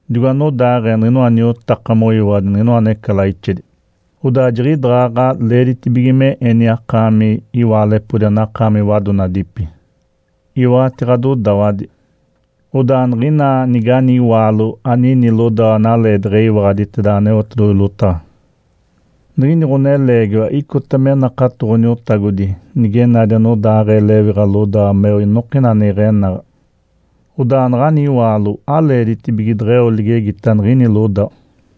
Digo anodaaɡ̶ee niɡ̶inoa niotaka moyiwaɡ̶adi niɡ̶inoa necalaixedi, odaa jiɡ̶idaɡ̶aɡ̶a leeditibige me eni akaami iwaalepodi anakaami wadonadipi, iwaɡ̶ati ɡ̶adodawadi. Odaa niɡ̶ina nigani iwaalo anini lodawa analeedaɡ̶a eyiwaɡ̶aditeda Aneotedoɡ̶oji lotaɡ̶a, niɡ̶ini ɡ̶oneleegiwa icota me nakato Ǥoniotagodi nige nadi anodaaɡ̶ee lewiɡ̶a lodawa meo inokina ane iɡ̶enaɡ̶a, odaa naɡ̶ani iwaalo aleeditibige deɡ̶eo ligegita niɡ̶ini lodawa.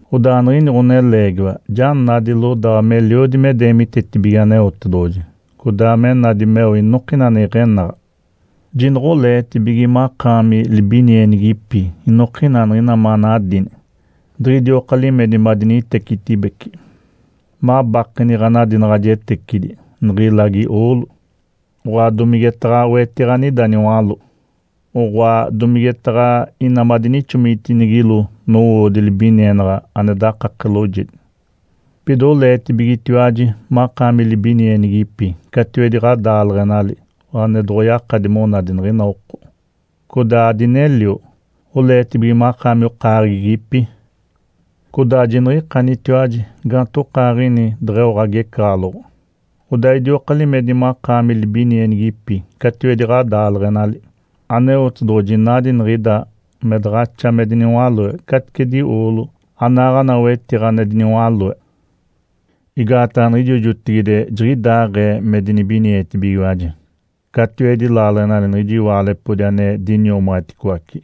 Odaa niɡ̶ini ɡ̶oneleegiwa ja nadi lodawa meliodi me deemitetibige Aneotedoɡ̶oji, codaa me nadi meo inokina ane iɡ̶enaɡ̶a. Jinoɡ̶oleetibige makaami libinienigipi inokina niɡ̶ina manadini, diɡ̶idioka limedi madinitecitibece, mabakeni ɡ̶anadinaɡ̶ajetecidi, niɡ̶ilagi oolo, oɡ̶oa domigetaɡ̶a wetiɡ̶a anida niwaló, oɡ̶oa domigetaɡ̶a ina madinixomitinigilo nowoodi libinienaɡ̶a ane dakake loojedi. Pida oleetibigetiwaji makaami libinienigipi catiwedi ɡ̶adaaleɡ̶enali ane doɡ̶oyakadi monadi niɡ̶ina oko, codaa adinelio. Oleetibige makaami okaaɡ̶egipi, codaa jiniɡ̶ikanitiwaji gaantokaaɡ̶ini deɡ̶eo ɡ̶agecaɡ̶aloɡ̶o, odaa idioka limedi makaami libinienigipi catiwedi ɡ̶adaaleɡ̶enali. Aneotedoɡ̶oji nadi niɡ̶ida me daɡ̶axa me diniwaloe caticedi oolo anaaɡ̶ana wetiɡ̶a ane diniwaloe. Igaataɡ̶a niɡ̶ijo jotigide jiɡ̶idaaɡ̶ee me dinibinietibigiwaji catiwedi laaleɡ̶enali niɡ̶ijo iwaalepodi ane diniomaɡ̶aditicoace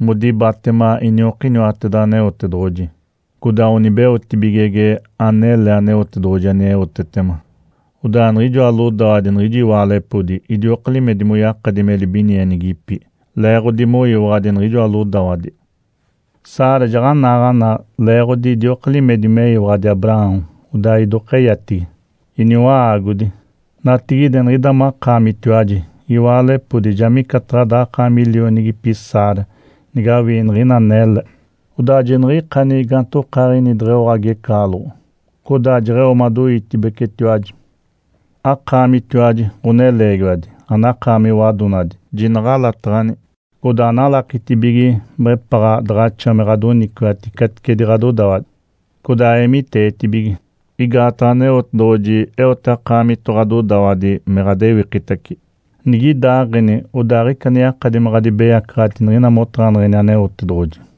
modibatema iniokiniwateda Aneotedoɡ̶oji, codaa onibeotibigege anele Aneotedoɡ̶oji aneotetema. Odaa niɡ̶ijoa lodawadi niɡ̶ijo iwaalepodi idioka limedi moyakadi me libinienigipi leeɡ̶odi moyiwaɡ̶adi niɡ̶ijoa lodawadi. Sara jaɡ̶anaaɡ̶ana leeɡ̶odi idioka limedi meyiwaɡ̶adi Abraão, odaa idokeyatigi “Iniwa-aagodi”. Natigide niɡ̶ida makaamitiwaji iwaalepodi ja micataɡ̶a daɡ̶akaami lionigipi Sara nigawii niɡ̶ina anele, odaa jiniɡ̶ikani gaantokaaɡ̶ini deɡ̶eo ɡ̶agecaɡ̶aloɡ̶o, codaa deɡ̶eo madoiitibecetiwaji. Akaamitiwaji, ɡ̶oneleegiwadi, anakaami wadonadi, jinaɡ̶alataɡ̶ani, codaa analakitibige mepaɡ̶a daɡ̶axa me ɡ̶adoniciwati caticedi ɡ̶adodawadi. Codaa eemiteetibige, igaataɡ̶a Aneotedoɡ̶oji eote akaamito ɡ̶adodawadi me ɡ̶adewikitace. Nigidaaɡ̶eni, odaa aɡ̶ica ane ɡ̶adibeyacaɡ̶ati niɡ̶ina motaɡ̶aneɡ̶eni Aneotedoɡ̶oji.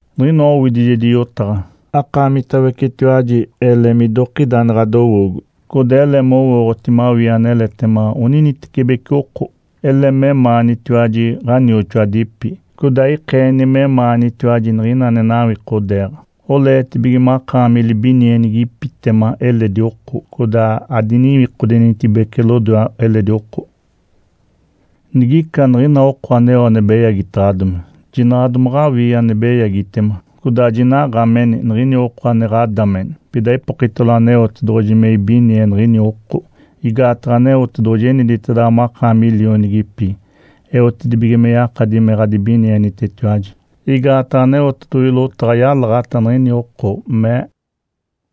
Niɡ̶inoa owidijedi yotaɡ̶a. Akaamitawecetiwaji ele midokida ane ɡ̶adowoogo, codaa ele mowooɡ̶oti mawii aneletema oninitecibeci oko. Ele memaanitiwaji ɡ̶anioxoadipi, codaa ikeeni memaanitiwaji niɡ̶ina ane nawikodeeɡ̶a. Oleetibige makaami libinienigipitema eledi oko, codaa adiniwikodenitibece lodoe eledi oko. Nigica niɡ̶ina oko aneo ane beyagitaɡ̶adomi, jinaɡ̶a domaɡ̶awii ane beyagitema. Codaa jinaɡ̶a ameni niɡ̶ina oko ane ɡ̶adame. Pida ipokitalo Aneotedoɡ̶oji me ibinie niɡ̶ini oko, igaataɡ̶a Aneotedoɡ̶oji eniditedaɡ̶awa makaami lionigipi eotedibige me yakadi me ɡ̶adibinienitetiwaji. Igaataɡ̶a Aneotedoɡ̶oji lotaɡ̶a yalaɡ̶ata niɡ̶ini oko, mee,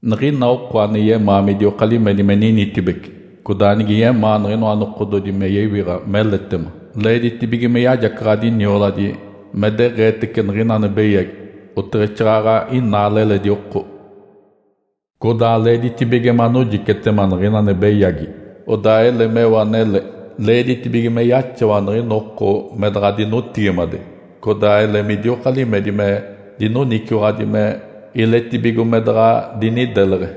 “Niɡ̶ina oko ane yemaa midioka limedi me ninitibece, codaa nige yemaa niɡ̶inoa nokododi me yewiɡ̶a meletema, leeditibige me yajacaɡ̶adi nioladi me deɡ̶eetece niɡ̶ina ane beyagi, oteɡ̶exaaɡ̶aɡ̶a inaale eledi oko. Codaa leeditibige manojicetema niɡ̶ina ane beyagi, odaa ele meo anele. Leeditibige me yaxawa niɡ̶ina oko me daɡ̶a dinotigimade, codaa ele midioka limedi me dinoniciwaɡ̶adi me iletibigo me daɡ̶a dinideleɡ̶e.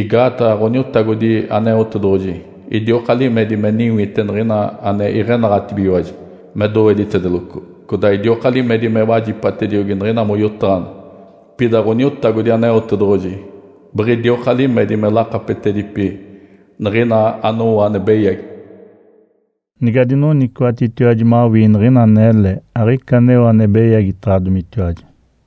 Igaataɡ̶a Ǥoniotagodi Aneotedoɡ̶oji idioka limedi me niwite niɡ̶ina ane iɡ̶enaɡ̶atibigiwaji me doweditedeloco. Codaa idioka limedi me wajipatediogi niɡ̶ina moyotaɡ̶aneɡ̶e. Pida Ǥoniotagodi Aneotedoɡ̶oji biɡ̶idioka limedi me lakapetedipi niɡ̶ina anowo ane beyagi.” Nigadinoniciwaɡ̶atitiwaji mawii niɡ̶ina anele, aɡ̶ica aneo ane beyagitaɡ̶adomitiwaji.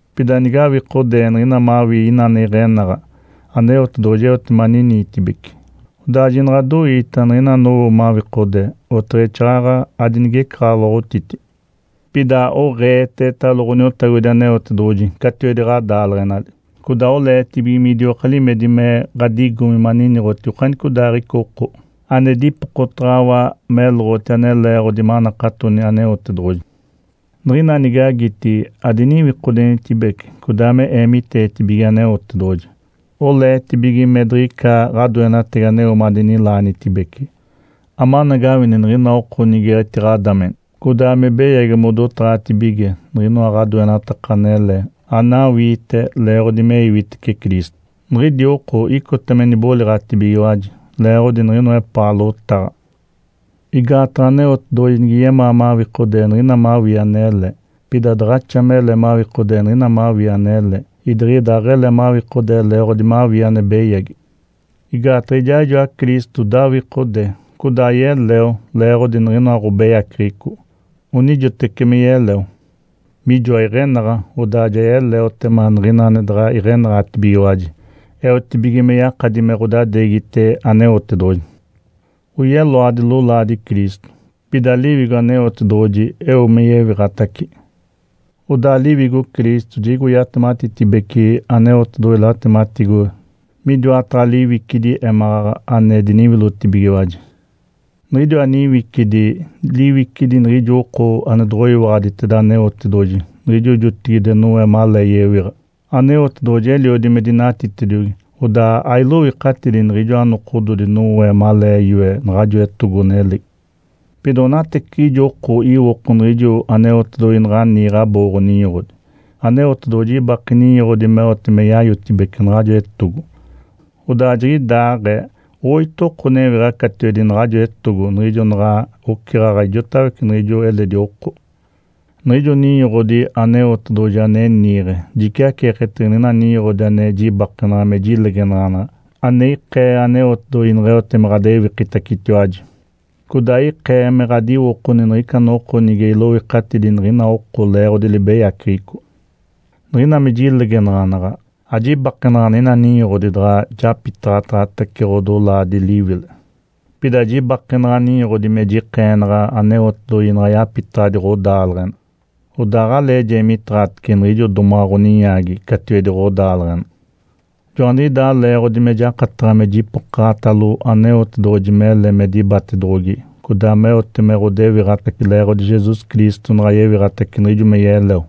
Pida nige awikodee niɡ̶ina mawii ina ane iɡ̶enaɡ̶a, Aneotedoɡ̶oji eote me aniniitibece. Odaa jinaɡ̶adoiita niɡ̶ina anowo mawikodee, oteɡ̶exaaɡ̶aɡ̶a adinigecaɡ̶aloɡ̶otiti. Pida oɡ̶eetetalo Ǥoniotagodi Aneotedoɡ̶oji catiwedi ɡ̶adaaleɡ̶enali, codaa oleetibige midioka limedi me ɡ̶adigomi maniniɡ̶oti okanicodaaɡ̶ica oko ane dipokotaɡ̶awa meloɡ̶oti ane leeɡ̶odi manakatoni Aneotedoɡ̶oji. Niɡ̶ina nigagiti, adiniwikodenitibece, codaa eemiteetibige Aneotedoɡ̶oji. Oleetibige me diɡ̶ica ɡ̶adoenatagi aneo madinilaanitibece, amanagawini niɡ̶ina oko nige etiɡ̶adameni, codaa me beyagi modotaɡ̶atibige niɡ̶inoa ɡ̶adoenataka anele anawiite leeɡ̶odi me iwitece Cristo, niɡ̶idi oko icota me niboliɡ̶atibigiwaji leeɡ̶odi niɡ̶inoa epaa lotaɡ̶a. Igaataɡ̶a Aneotedoɡ̶oji nige yemaa mawikodee niɡ̶ina mawii anele, pida daɡ̶axa mele mawikodee niɡ̶ina mawii anele, idiɡ̶ida aɡ̶ele mawikodee leeɡ̶odi mawii ane beyagi. Igaataɡ̶a ijaaɡ̶ijoa Cristo dawikode, codaa yeleo leeɡ̶odi niɡ̶inoa ɡ̶obeyaceɡ̶eco. Onijoteci me yeleo, mijoa iɡ̶enaɡ̶a odaa ja yeleotema niɡ̶ina ane daɡ̶a iɡ̶enaɡ̶atibigiwaji eotibige me yakadi me ɡ̶odadeegite Aneotedoɡ̶oji. Oyeloadi lolaadi Cristo, pida Liwigo Aneotedoɡ̶oji eo me yewiɡ̶atace. Odaa Liwigo Cristo jiɡ̶igo yatematitibece Aneotedoɡ̶oji latematigo midiwataɡ̶a liwicidi émaɡ̶aɡ̶a ane diniwilotibigiwaji. Niɡ̶idiwa niwicidi, liwicidi niɡ̶ijo oko ane doɡ̶oyiwaɡ̶aditeda Aneotedoɡ̶oji niɡ̶ijo jotigide Noé malee yewiɡ̶a. Aneotedoɡ̶oji eliodi me dinatitediogi, odaa ailoikatidi niɡ̶ijoa nokododi Noé malee yoe naɡ̶ajo etogo-nelegi. Pida onateciɡ̶ijo oko iwoko niɡ̶ijo Aneotedoɡ̶oji naɡ̶a niiɡ̶e abooɡ̶o-ninyoɡ̶odi. Aneotedoɡ̶oji ibake ninyoɡ̶odi meote me yayotibece naɡ̶ajo etogo, odaa jiɡ̶idaaɡ̶ee oito oko newiɡ̶a catiwedi naɡ̶ajo etogo niɡ̶ijo naɡ̶a oceɡ̶aɡ̶a ijotawece niɡ̶ijo eledi oko. Niɡ̶ijo ninyoɡ̶odi Aneotedoɡ̶oji ane niiɡ̶e jiciaceeketege niɡ̶ina ninyoɡ̶odi ane jibakenaɡ̶a me jilegenaɡ̶anaɡ̶a ane ikee Aneotedoɡ̶oji neɡ̶eote me ɡ̶adewikitacetiwaji, codaa ikee me ɡ̶adiwokoni niɡ̶ica noko nige iloikatidi niɡ̶ina oko leeɡ̶odi libeyaceɡ̶eco. Niɡ̶ina me jilegenaɡ̶anaɡ̶a, ajibakenaɡ̶a niɡ̶ina ninyoɡ̶odi daɡ̶a japitaɡ̶ataɡ̶atece ɡ̶odolaadi liwile, pida jibakenaɡ̶a ninyoɡ̶odi me jikeenaɡ̶a Aneotedoɡ̶oji naɡ̶a yapitaɡ̶adi ɡ̶odaaleɡ̶ena, odaa aɡ̶alee jeemiteeɡ̶atece niɡ̶ijo domaɡ̶a ɡ̶oninyaagi catiwedi ɡ̶odaaleɡ̶ena. Joaniɡ̶idaa leeɡ̶odi me jakataɡ̶a me jipokaɡ̶atalo Aneotedoɡ̶oji mele me dibatedoɡ̶ogi, codaa meote me ɡ̶odewiɡ̶atace leeɡ̶odi Jesus Cristo naɡ̶a yewiɡ̶atace niɡ̶ijo me yeleo.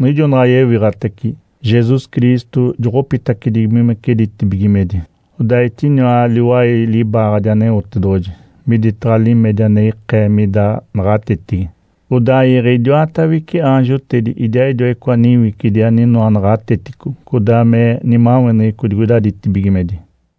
Niɡ̶ijo naɡ̶a yewiɡ̶atace, Jesus Cristo joɡ̶opitedibigimece ditibigimedi, odaa etiniwa liwai libaaɡ̶adi Aneotedoɡ̶oji, miditaɡ̶a limedi ane ikee mida naɡ̶atetigi. Odaa iiɡ̶e idiwatawece aanjotedi idiaaɡ̶idiwa icoa niwicidi aninoa naɡ̶atetico codaa me nimaweneɡ̶eco digoida ditibigimedi.